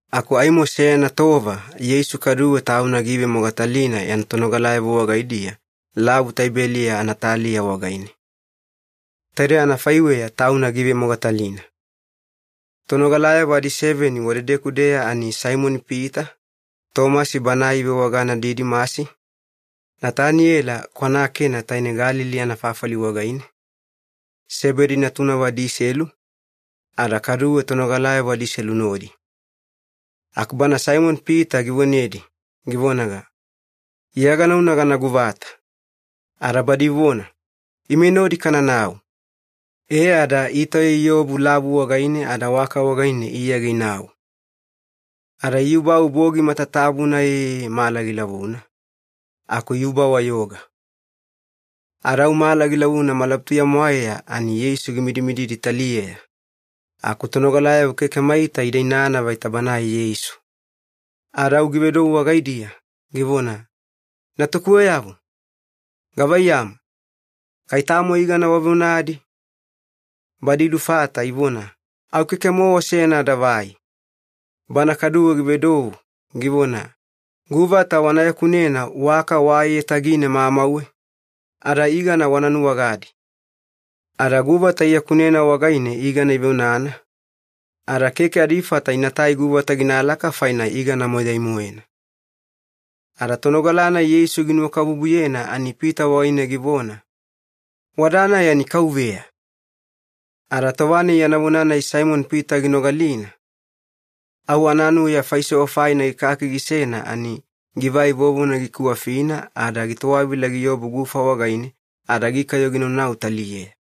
Aku aimo seyana tova Yeisu kaduwe Tauna giivemogatalina yana tonogalayavo wagaidiya Lavu Tibeliya anataliya wagaine. Taide anafaiweya Tauna giivemogatalina. Tonogalayavo adiseveni wadedeku-deya ani Saimoni-Pita, Tomasi banae ivewagana Didimasi, Nataniyela kwana Kena taine Galili anafafali wagaine, Sebedi natunavo adiselu, ada kaduwe tonogalayavo adiselu nodi. Aku bana Saimoni-Pita givonedi, givonaga, “Iya ganauna gana guvata.” Ada badi ivona, “Ime nodi kananau.” E ada itauya iobu lavu wagaine ada waka wagaine iyage inau. Ada iyubau bogi matatabuna eee mala gilavuna, aku iyuba-wayoga. Ada au mala gilavuna malabutuya-mwaeya ani Yeisu gimidimididi taliyeya, aku tonogalayavo keke maita ida inana vaita banae Yeisu. Ada au givedou wagaidiya, givona, “Natukuweyavo, gavaiyamu, kai tamo igana waveonadi?” Badi ilufata ivona, “Au keke-mowa seyana adavai.” Bana kaduwe givedou, givona, “Guvata wana yakunena waka wa aiyatagine mamauwe, ada igana wana nuwagadi.” Ada guvata iyakunena wagaine igana iveonana, ada keke adifata inatai guvata ginalaka faina igana moyai-moena. Ada tonogala-nai Yeisu ginuwakabubuyena ani Pita wagaine givona, “Wada-nai ani Kauveya!” Ada tova-nai yana vona-nai Saimoni-Pita ginogalina, au ananuya faisewa faina gikaki gisena ani givai vovona gikiwafina ada gitowavila giobu gufa wagaine ada gikayo ginaunau taliyeya.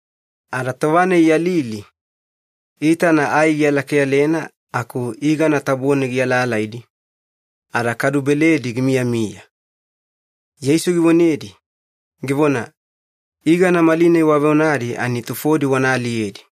Ada tova-nai iyalili, iitana ai gialakeyalena aku igana tabone gialaalaidi, ada kadu beledi gimiyamiya. Yeisu givonedi, givona, “Igana malinai waveonadi ani tufodi wana aliyedi.”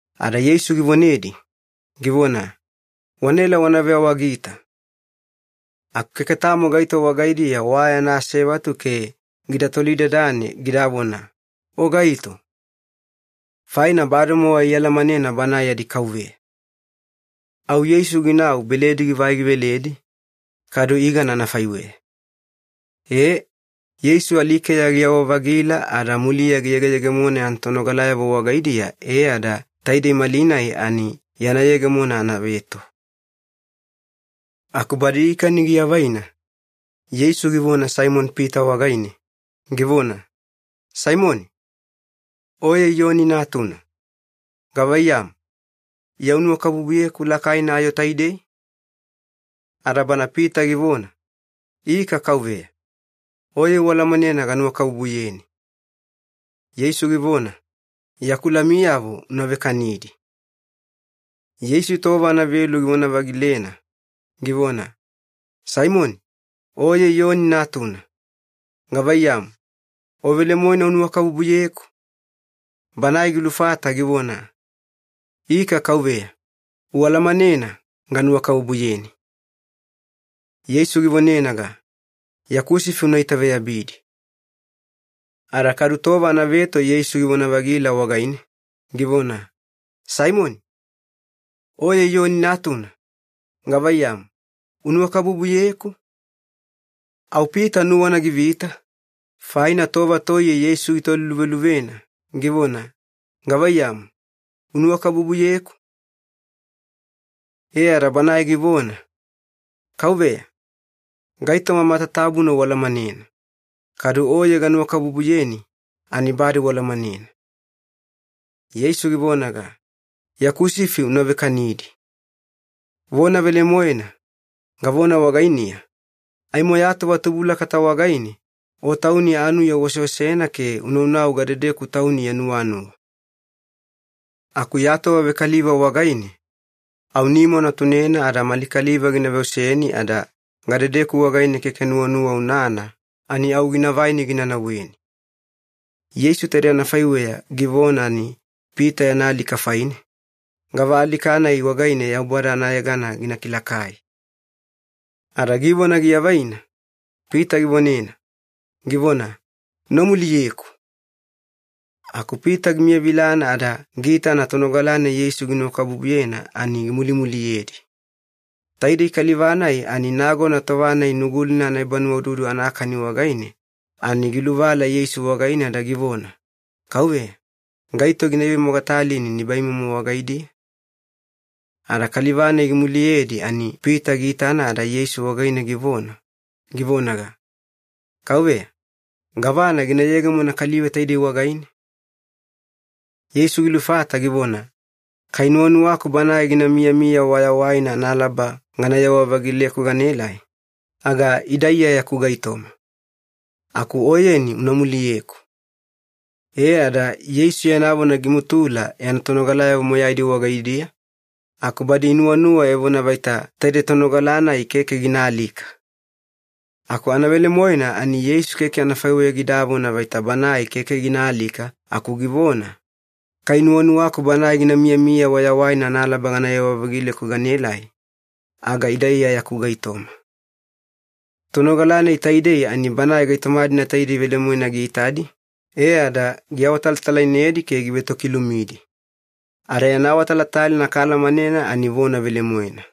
Ada Yeisu givonedi, givona, “Wanaela wana veawagita.” Aku keke tamo gaito wagaidiya wa yana asevatu ke gida tolidadane gidavona, “O gaito?” Faina bademowa ialamanena Banae yadi Kauveya. Au Yeisu ginau beledi givai giveledi, kadu igana anafaiweya. E, Yeisu alikeya giyawa-vagila ada muliya giyegeyegemona yana tonogalayavo wagaidiya e ada taidei malinai ani yana yegemona anaveto. Aku badi ikani giavaina, Yeisu givona Saimoni-Pita wagaine, givona, “Saimoni, oye Iyoni natuna, gavaiyamu, Iya unuwakabubuyeku lakaina ayo taidei?” Ada bana Pita givona, “Ika Kauveya, oye ualamanena ganuwakabubuyeni.” Yeisu givona, “Yaku lamiyavo una vekanidi.” Yeisu tova anavelu givona-vagilena, givona, “Saimoni, oye Iyoni natuna, gavaiyamu, o velemoena unuwakabubuyeku?” Banae gilufata givona, “Ika Kauveya, ualamanena ganuwakabubuyeni.” Yeisu givonenaga, “Yaku sifi una itaveyabidi.” Ada kadu tova anaveto Yeisu givona-vagila wagaine, givona, “Saimoni, oye Iyoni natuna, gavaiyamu, unuwakabubuyeku?” Au Pita nuwana givita, faina tova toiye Yeisu gitoliluveluvena, givona, “Gavaiyamu, unuwakabubuyeku?” E ada banae givona, “Kauveya, gaitoma matatabuna ualamanena, kadu oye ganuwakabubuyeni ani bade ualamanena.” Yeisu givonaga, “Yaku sifi una vekanidi. Vona velemoena, gavona wagainiya, aimo ya tova tubulakata wagaine o tauni anuya uoseosena ke unaunau gadedeku tauni ya nuwanuwa. Aku ya tova vekaliva wagaine, au nima una tunena ada mali kaliva gina veoseni ada gadedeku wagaine keke nuwanuwa unana ani au gina vaini gina nauweni.” Yeisu taidei anafaiweya givona ani Pita yana alika faine, gava alika-nai wagaine Yaubada anayegana gina kilakai. Ada givona giavaina, Pita givonena, givona, “Una muliyeku.” Aku Pita gimiyavilana ada giitana tonogala-nai Yeisu ginuwakabubuyena ani gimulimuliyedi. Taidei kaliva-nai ani nagona tova-nai Nugulina anaebanuwaududu anakani wagaine, ani giluvala Yeisu wagaine ada givona, “Kauveya, gaito gina ivemogatalini nibaimomo wagaidiya?” Ada kaliva-nai gimuliyedi ani Pita giitana ada Yeisu wagaine givona, givonaga, “Kauveya, gavana gina yegemona kaliva taidei wagaine?” Yeisu gilufata givona, “Kai nuwanuwaku banae gina miyamiya wayawaina analaba ganayewa-vagileku ganaelai, aga ida Iya yaku gaitoma. Aku oyeni una muliyeku.” E ada Yeisu yana vona gimutula yana tonogalayavo moyaidi wagaidiya, aku badi inuwanuwa evona vaita taidei tonogala-nai keke gina alika. Aku anavelemoena ani Yeisu keke anafaiweya gidavona vaita banae keke gina alika, aku givona, “Kai nuwanuwaku banae gina miyamiya wayawaina analaba ganayewa-vagileku ganaelai, aga ida Iya yaku gaitoma.” Tonogala-nai taidei ani banae gaitoma-dina taidei velemoena giitadi, e ada giawatalatalainedi ke givetokilumidi. Ada yana awatalatalaina kaalamanena ani vona velemoena.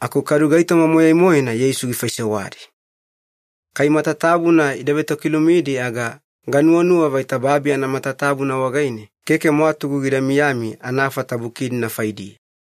Aku kadu gaitoma moyai-moena Yeisu gifaisewadi. Kai matatabuna ida vetokilumidi aga ganuwanuwa vaita babi anamatatabuna wagaine keke mwatugu gida miyami anafata buki-dina faidiya.